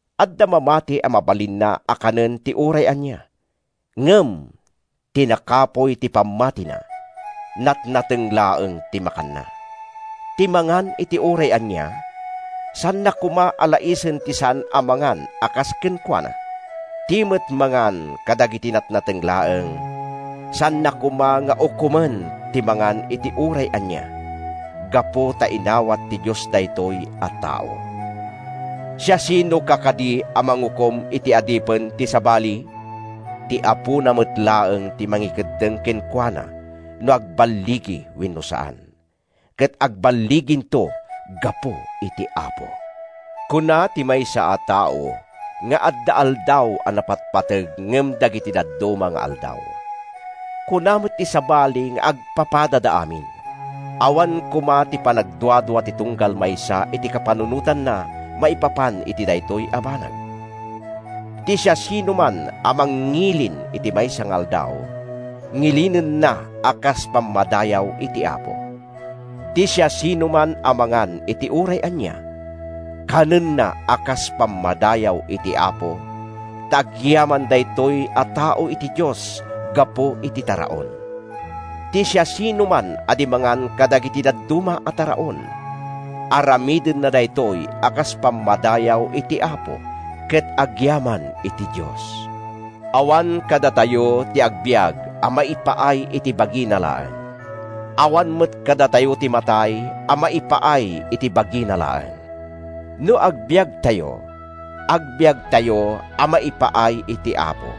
Adda mamati a mabalinna a kanen ti uray ania, ngem ti nakapuy ti pammatina, natnateng laeng ti makanna. Ti mangan iti uray ania, saanna koma a laisen ti saan a mangan a kas kenkuana. Ti met mangan kadagiti natnateng laeng, saanna koma nga ukomen ti mangan iti uray ania, gapu ta inawat ti Dios daytoy a tao. Siasinoka kadi a mangukom iti adipen ti sabali? Ti apona met laeng ti mangikeddeng kenkuana no agballigi wenno saan. Ket agballiginto gapu iti Apo. Kuna ti maysa a tao nga adda aldaw a napatpateg ngem dagiti dadduma nga aldaw. Kuna met ti sabali nga agpapadada amin. Awan koma ti panagduadua ti tunggal maysa iti kapanunotanna maipapan iti daytoy a banag. Ti siasinoman a mangngilin iti maysa nga aldaw, ngilinenna a kas pammadayaw iti Apo. Ti siasinoman a mangan iti uray ania, kanenna a kas pammadayaw iti Apo, ta agyaman daytoy a tao iti Dios gapu iti taraon. Ti siasinoman a di mangan kadagiti dadduma a taraon, aramidenna daytoy a kas pammadayaw iti Apo, ket agyaman ti Dios. Awan kadatayo ti agbiag a maipaay iti bagina laeng. Awan met kadatayo ti matay a maipaay iti bagina laeng. No agbiagtayo, agbiagtayo a maipaay iti Apo,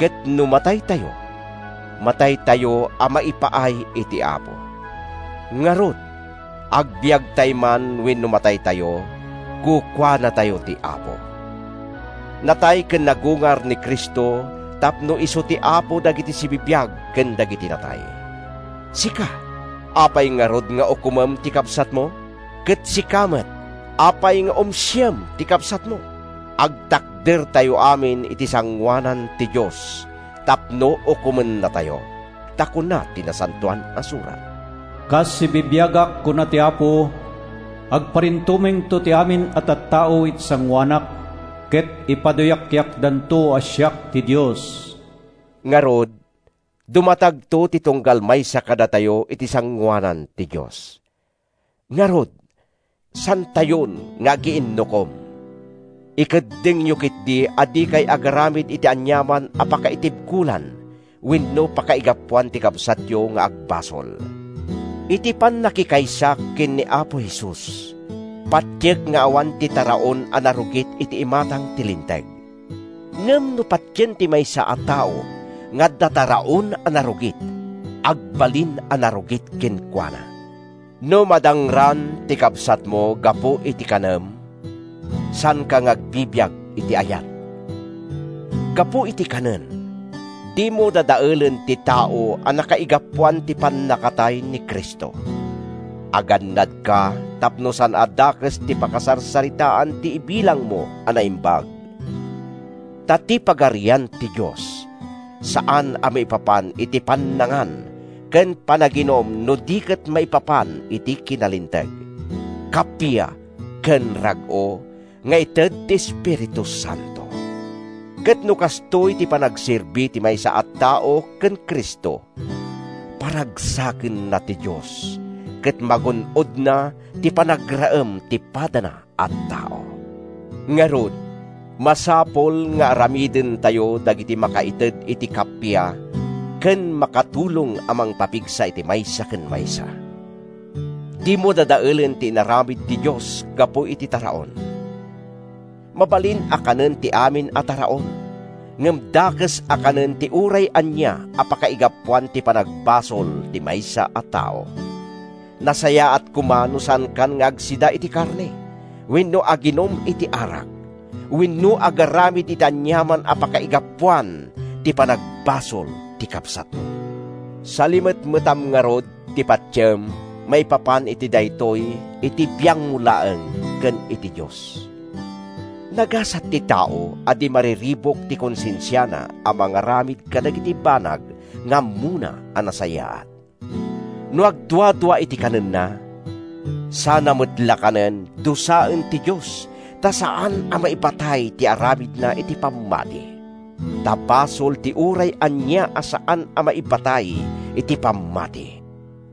ket no mataytayo, mataytayo a maipaay iti Apo. Ngarud, agbiagtay man wenno mataytayo, kukuanatayo ti Apo. Natay ken nagungar ni Cristo tapno isu ti Apo dagiti sibibiag ken dagiti natay. Sika, apay ngarud nga ukomem ti kabsatmo? Ket sika met, apay nga umsiem ti kabsatmo? Agtakdertayto amin iti sangoanan ti Dios tapno ukomennatayo. Ta kuna ti Nasantoan a Surat, “Kas sibibiagak, kuna ti Apo, agparintumengto ti amin a tattao iti sangoanak, ket ipaduyakyakdanto a siak ti Dios.” Ngarud, dumatagto ti tunggal maysa kadatayo iti sangoanan ti Dios. Ngarud, saantayon nga agiinnukom. Ikeddengyo ketdi a dikay agaramid iti aniaman a pakaitibkolan wenno pakaigapuan ti kabsatyo nga agbasol. Iti pannakikaysak ken ni Apo Jesus, patiek nga awan ti taraon a narugit iti imatang ti linteg. Ngem no patien ti maysa a tao nga adda taraon a narugit, agbalin a narugit kenkuana. No madangran ti kabsatmo gapu iti kanem, saanka nga agbibiag iti ayat! Gapu iti kanen, dimo dadaelen ti tao a nakaigapuan ti pannakatay ni Cristo! Agannadka tapno saan a dakes ti pakasarsaritaan ti ibilangmo a naimbag. Ta ti Pagarian ti Dios saan a maipapan iti pannangan ken panaginum no di ket maipapan iti kinalinteg, kappia ken rag-o nga ited ti Espiritu Santo. Ket no kastoy ti panagserbi ti maysa a tao ken Cristo, paragsakenna ti Dios ket magun-odna ti panagraem ti padana a tao. Ngarud, masapul nga aramidentayo dagiti makaited iti kappia ken makatulong a mangpapigsa iti maysa ken maysa. Dimo dadaelen ti inaramid ti Dios gapu iti taraon. Mabalin a kanen ti amin a taraon, ngem dakes a kanen ti uray ania a pakaigapuan ti panagbasol ti maysa a tao. Nasayaat koma no saankan nga agsida iti karne, wenno aginum iti arak, wenno agaramid iti aniaman a pakaigapuan ti panagbasol ti kabsatmo. Salimetmetam ngarud ti patiem maipapan iti daytoy iti biangmo laeng ken iti Dios. Nagasat ti tao a di mariribuk ti konsensiana a mangaramid kadagiti banag nga ammona a nasayaat! No agduadua iti kanenna, sana met la kanen, dusaen ti Dios ta saan a maibatay ti aramidna iti pammati. Ta basol ti uray ania a saan a maibatay iti pammati.